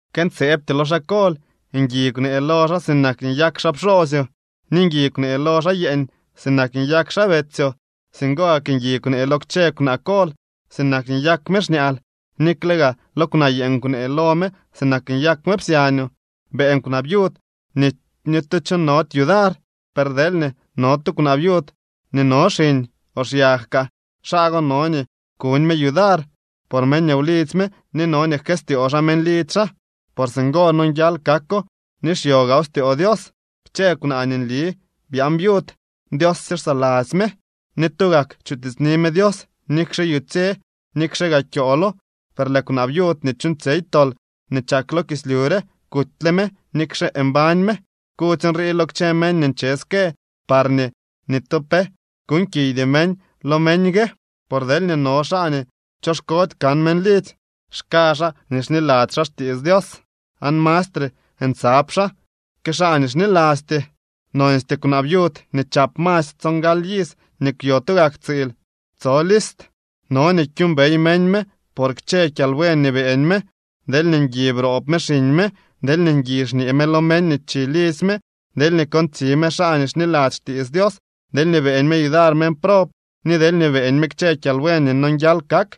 Këntseebtyoo lo xaa kol. Ngui kwnee lo xaa sinak nii nyak xaa pxoosyoo. Ni ngui kwnee lo xaa yeeñ sinak nyak xaa betsyoo. Singo gak ngui kwnee lo kchë kwaa kol sinak nii nyak me xñaal. Nikle gaa lo kwnaa yeeñ kwnee lo me sinak nyak me psyañoo. Beeñ kwnaa viud nii ni tu chonody yudar. Per deelñee no tu kwnaa viud nii no xiñ o xyag kaa, xaa go no nii kuñ me yudar por meñ wlidzy me ni no nii jkëstyoo xaa meñ lidzy xaa por singo nonguial kako ni xyo gaaw styoo Dios. Kchë kwnaa nii nli byaan viud, Dios sye xsaladzy me, ni tugak chutiitsni me Dios nikxe yutsye nikxe gaa kyoolo. Per lëë kwnaa viud nii chuuñtsyey tol nii chak lo kislyu re, kutyle me nikxe mbañ me. Kudzy nrii lo kchë meñ nii nche ske parñee ni tu pe kuuñkiydy meñ lo meñ gue. Por deelñee no xaa nii choxkody kan meñ lidzy, xka xaa nii xniladzy xaa xtiits Dios aan mastre ntsab xaa que xaa nii xnilasty. Nonstyee kwnaa viud nii chap masy tsongaly iz ni kwyo tugak tsiil tso list. No nii kyuumbey meñ me por kchë kyalbuen nii beeñ me: deelñee ngui broob me xiñ me, deelñee ngui xñee me lo meñ nii chi lidzy me, deelñee kontsi me xaa nii xniladzy xtiits Dios, deelñee beeñ me yudar meñ prob, ni deelñee beeñ me kchë kyalbuen nii nonguial kak.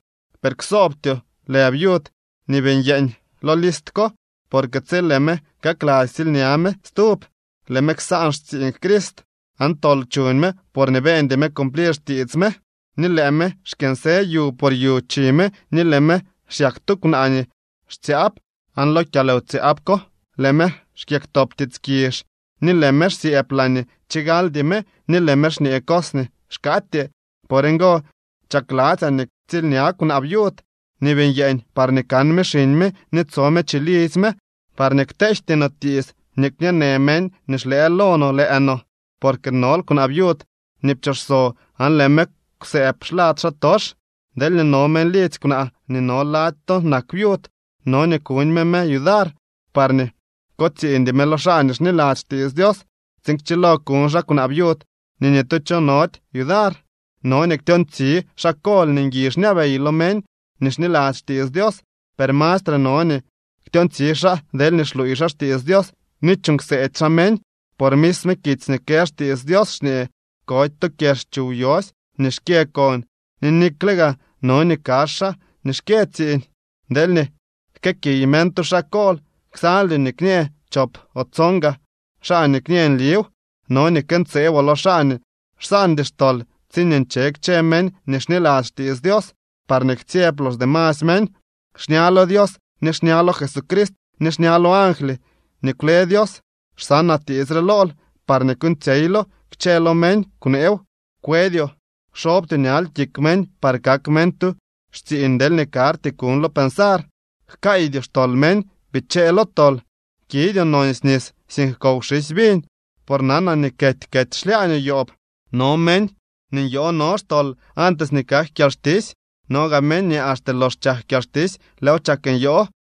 Per ksoobtyoo lë viud nii bii nyeeñ lo list ko. Porque tsi lëë me kakladzy ktsiilña me stub, lëë me ksaan xtsiiñ Crist. Aan tol chuñ me porñee beñdy me cumplir xtiits me. Ni lëë me xkyënsë yu por yu chi me ni lëë me xyak tu kwnaa nii xtsyaab aan lo kyalwtsyaab ko, lëë me xkyëktop tiits kizh, ni lëë me xsyëëb laañee chigaldy me ni lëë me xñee cos nii xkaatyee. Por ngo chakladzyaa nii ktsiilña kwnaa viud nii bii nyeeñ parñee kan me xiñ me ni tso me chilidzy me, parñee kteejty no tiits nii kñee në meñ nii xlëë lo no lëë no. Porque nol kwnaa viud nii pchooxso aan lëë me kwsëëb xlad xaatox. Deelñee no meñ lidzy kwnaa nii no lady to nak viud, no nii kuñ me me yudar, parñee kotsiiñdy me lo xaa nii xniladzy xtiits Dios, tsiin kchilo kuñ xaa kwnaa viud nii ni tu cho nody yudar. No nii ktyoontsi xaa kol nii ngui xñabey lo meñ nii xniladzy xtiits Dios, per mastre no nii ktyoontsi xaa deelñee xluuy xaa xtiits Dios ni chuuñ kseedy xaa meñ. Por misme kitsy nii kë xtiits Dios xñee: “Kody to kyex chuw yosy nii xkyë kon.” Ni nikle gaa: “No nii kazh xaa nii xkyë tsiiñ.” Deelñee jkëëkiy meñ tu xaa kol, ksaldyoo nii kñee chop o tson gaa xaa nii kñë nliw. No nii këntseeboo lo xaa nii xsaandy xtol tsiñee nche kchë meñ nii xniladzy xtiits Dios, parñee ktsyeb los demasy meñ. Xña lo Dios ni xña lo Jesucrist ni xña lo angly nii kwle Dios, xsanaa tiits re lool parñee kuuñtsyeylo. Kchë lo meñ, kwneew; kwedyoo. Kxobtyoo ñal kik meñ par kak meñ tu xtsiiñ deelñee karty kuñlo pensar. Jkaaydyoo xtol meñ. Bichee lo tol. Kidyoo nonsy nis, sink kow xisy viñ, por nanaa nii kety kety xlyaañoo yoob. No meñ nii nyoo no xtol antes nii kak kyalxtisy. No gaa meñ nii axte lox chak kyalxtisy lëëw chak nyoo.